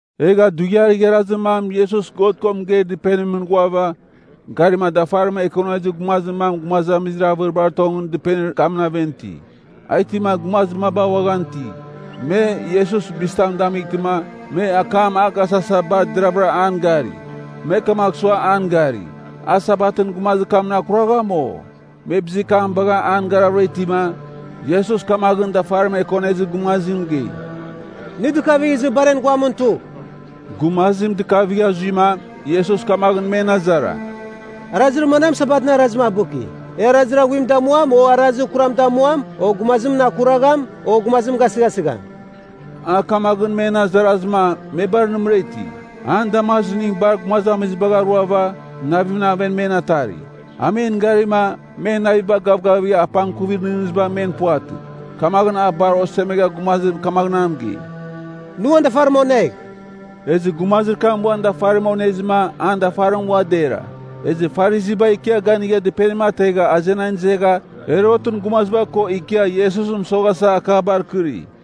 Egha dughiar igharazir mam Iesus God ko mɨgeir dɨpenimɨn ghuava, garima dafarim ekonezir gumazir mam gumazamizir avɨribar tongɨn dɨpenir kamɨn aven iti. A itima gumazir maba uaghan iti. Me, Iesus bizitam damightɨma, me akam agasasa bar deravɨra an gari. Me kamagh sua an gari. A Sabatɨn gumazir kamɨn akuragham, o? Me bizir kam bagha an garavɨra itima, Iesus kamaghɨn dafarim ekonezir gumazim mɨgei, “Nɨ dɨkavigh izɨ bar en guamɨn tugh.” Gumazim dɨkavigha tuzɨma, Iesus kamaghɨn men azara, “Arazir manam Sabatɨn arazim abɨki? E arazir aghuim damuam, o arazir kuram damuam, o gumazimɨn akuragham, o gumazim gasɨghasɨgham?” A kamaghɨn men azarazɨma, me bar nɨmɨra iti. An damazimning bar gumazamizibagh aruava, navimɨn aven men atari. A men garima, men naviba gavgavigha apangkuvir nɨghnɨziba men puvatɨ. Kamaghɨn a bar osemegha gumazim kamaghɨn a mɨgei, “Nɨ uan dafarim onegh.” Ezɨ gumazir kam uan dafarim onezɨma, an dafarim ua dera. Ezɨ Farisiba ikia ganigha dɨpenim ategha azenan izegha Herotɨn gumaziba ko ikia Iesusɨn mɨsoghasa akabar kɨri.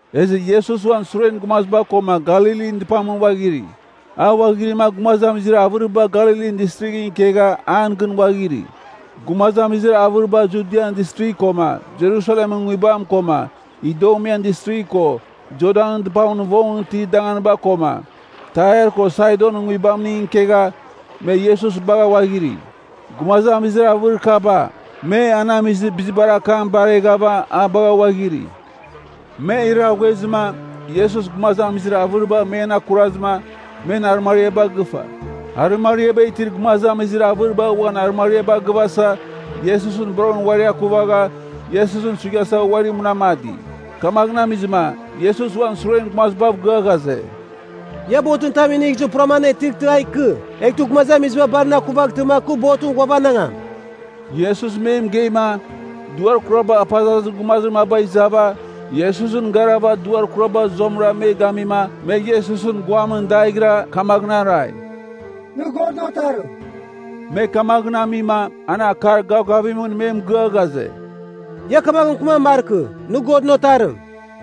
Ezɨ Iesus uan suren gumaziba koma Galilin dɨpamɨn ghuaghiri. A ghuaghirima gumazamizir avɨriba Galilin Distrighɨn ikegha an gɨn ghuaghiri. Gumazamizir avɨriba Judian Distrigh koma Jerusalemɨn nguibam koma Idumean Distrigh ko Jordanɨn dɨpamɨn vongɨn itir danganiba koma Tair ko Saidonɨn nguibamning ikegha, me Iesus bagha ghuaghiri. Gumazamizir avɨrir kaba, me an amizir bizibar akam bareghava a bagha ghuaghiri. Me iraghuezɨma, Iesus gumazamizir avɨriba men akurazɨma, men arɨmariaba gɨfa. Arɨmariaba itir gumazamizir avɨriba uan arɨmariaba gɨvasa Iesusɨn boroghɨn uari akuvagha, Iesusɨn suighasa uari munamadi. Kamaghɨn amizɨma, Iesus uan suren gumazibav gɨa ghaze, “Ia botɨn tam inigh izɨ puram anetɨghtɨ a ikɨ. Eghtɨ gumazamiziba bar na akuvaghtɨma kɨ botɨn ghuavanangam.” Iesus me mɨgeima, duar kuraba apazazir gumazir maba izava, Iesusɨn garava duar kuraba zuamɨra me gamima me Iesusɨn guamɨn daighɨra kamaghɨn arai, “Nɨ Godɨn Otarim.” Me kamaghɨn amima, an akar gavgavimɨn me mɨgɨa ghaze, “Ia kamaghɨn mɨkɨman markɨ, ‘Nɨ Godɨn Otarim.’”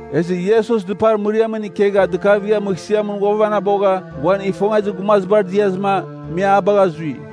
Ezɨ Iesus dɨpar mɨriamɨn ikegha dɨkavighava mɨghsɨamɨn ghuavanabogha uan ifongezir gumazibar diazɨma, me a bagha zui.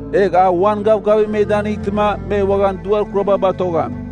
Egh a uan gavgavim me danɨngtɨma me uaghan duar kuraba batogham.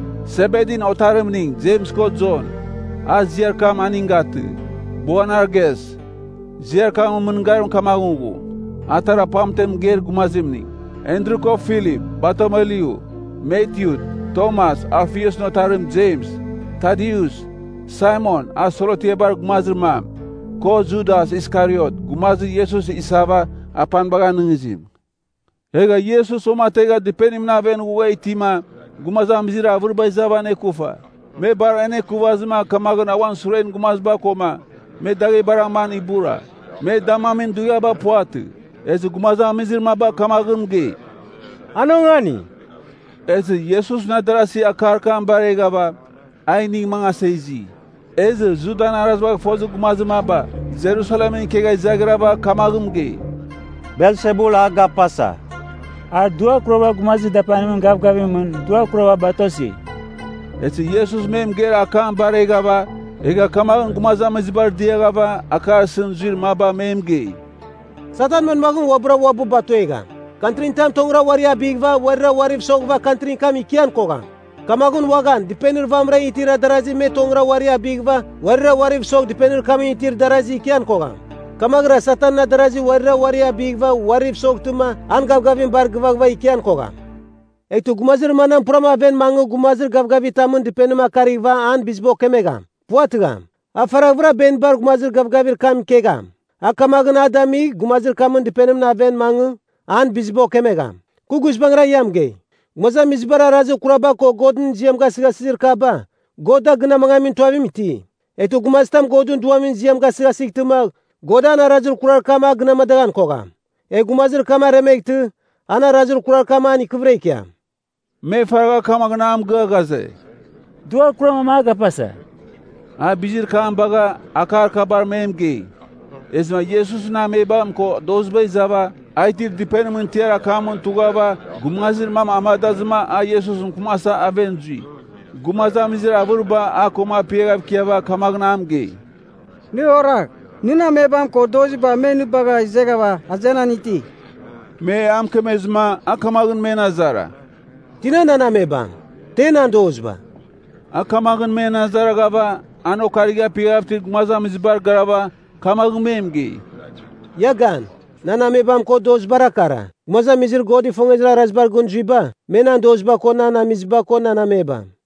Sebedin otarimning Jems ko Jon (A ziar kam aning gatɨ, Boanerges. Ziar kamɨn mɨngarim kamaghɨn ghu, atara pamtem mɨgeir gumazimning), Andru ko Filip, Bartolomyu, Matyu, Tomas, Alfiusɨn otarim Jems, Tadius, Saimon (a Selotiabar gumazir mam), ko Judas Iskariot, gumazir Iesus isava, apanibagh anɨngizim. Egha Iesus uamategha dɨpenimɨn aven ghugha itima gumazamizir avɨriba izava anekufa. Me bar anekuvazɨma kamaghɨn a uan suren gumaziba koma me daghebar aman ibura. Me damamin dughiaba puvatɨ. Ezɨ gumazamizir maba kamaghɨn mɨgei, “An ongani.” Ezɨ Iesusɨn adarasi akar kam bareghava, a inigh mangasa izi. Ezɨ Judan arazibagh fozir gumazir maba Jerusalemɨn ikegha izaghrava kamaghɨn mɨgei, “Belsebul a gapasa. A duar kurabar gumazir dapanimɨn gavgavimɨn duar kuraba batosi.” Ezɨ Iesus me mɨgeir akam bareghava, egha kamaghɨn gumazamizibar diaghava akar isɨn zuir maba me mɨgei, “Satan manmaghɨn uabɨra uabɨ batuegham? Kantrin tam tongɨra uari abɨghɨva uarira uariv soghɨva kantrin kam ikian kogham. Kamaghɨn uaghan, dɨpenir vamɨran itir darasi me tongɨra uari abɨghɨva uarira uariv sogh dɨpenir kamɨn itir darasi ikian kogham. Kamaghɨra Satanɨn adarazi uarira uari abɨghɨva uariv mɨsoghtɨma an gavgavim bar gɨvaghɨva ikian kogham. “Eghtɨ gumazir manam puram aven mangɨ gumazir gavgavitamɨn dɨpenim akarighɨva an biziba okemegham? Puvatɨgham. A faraghvɨra benibar gumazir gavgavir kam ikegham. A kamaghɨn a damigh gumazir kamɨn dɨpenimɨn aven mangɨ, an biziba okemegham. “Kɨ guizbangɨra ia mɨgei, gumazamizibar arazir kuraba ko me Godɨn ziam gasɨghasɨzir akaba, God da gɨn amangamin tuavim iti. Eghtɨ gumazitam Godɨn Duamɨn ziam gasɨghasightɨma God an arazir kurar kam, a gɨn amadaghan kogham. Egh gumazir kam aremeghtɨ, arazir kurar kam an ikɨvɨra ikiam.” Me faragha kamaghɨn a mɨgɨa ghaze, “Duar kurar mam a gapasa.” A bizir kam bagha, akar kabar me mɨgei. Ezɨma Iesusɨn amebam ko doziba izava, a itir dɨpenimɨn tiar akamɨn tughava gumazir mam amadazɨma a Iesusɨn mɨkɨmasa aven zui. Gumazamizir avɨriba a koma apiaghav ikiava kamaghɨn a mɨgei, “Nɨ oragh, nɨn amebam ko doziba me nɨ bagha izeghava azenan iti.” Me a mɨkemezɨma a kamaghɨn men azara, “Tina nan amebam? Te nan doziba?” A kamaghɨn men azaraghava, an okarigha apiaghav itir gumazamizibar garava, kamaghɨn me mɨgei, “Ia gan! Nan amebam ko dozibara kara. Gumazamizir God ifongezir arazibar gɨn zuiba, me nan doziba ko nan amiziba ko nan amebam.”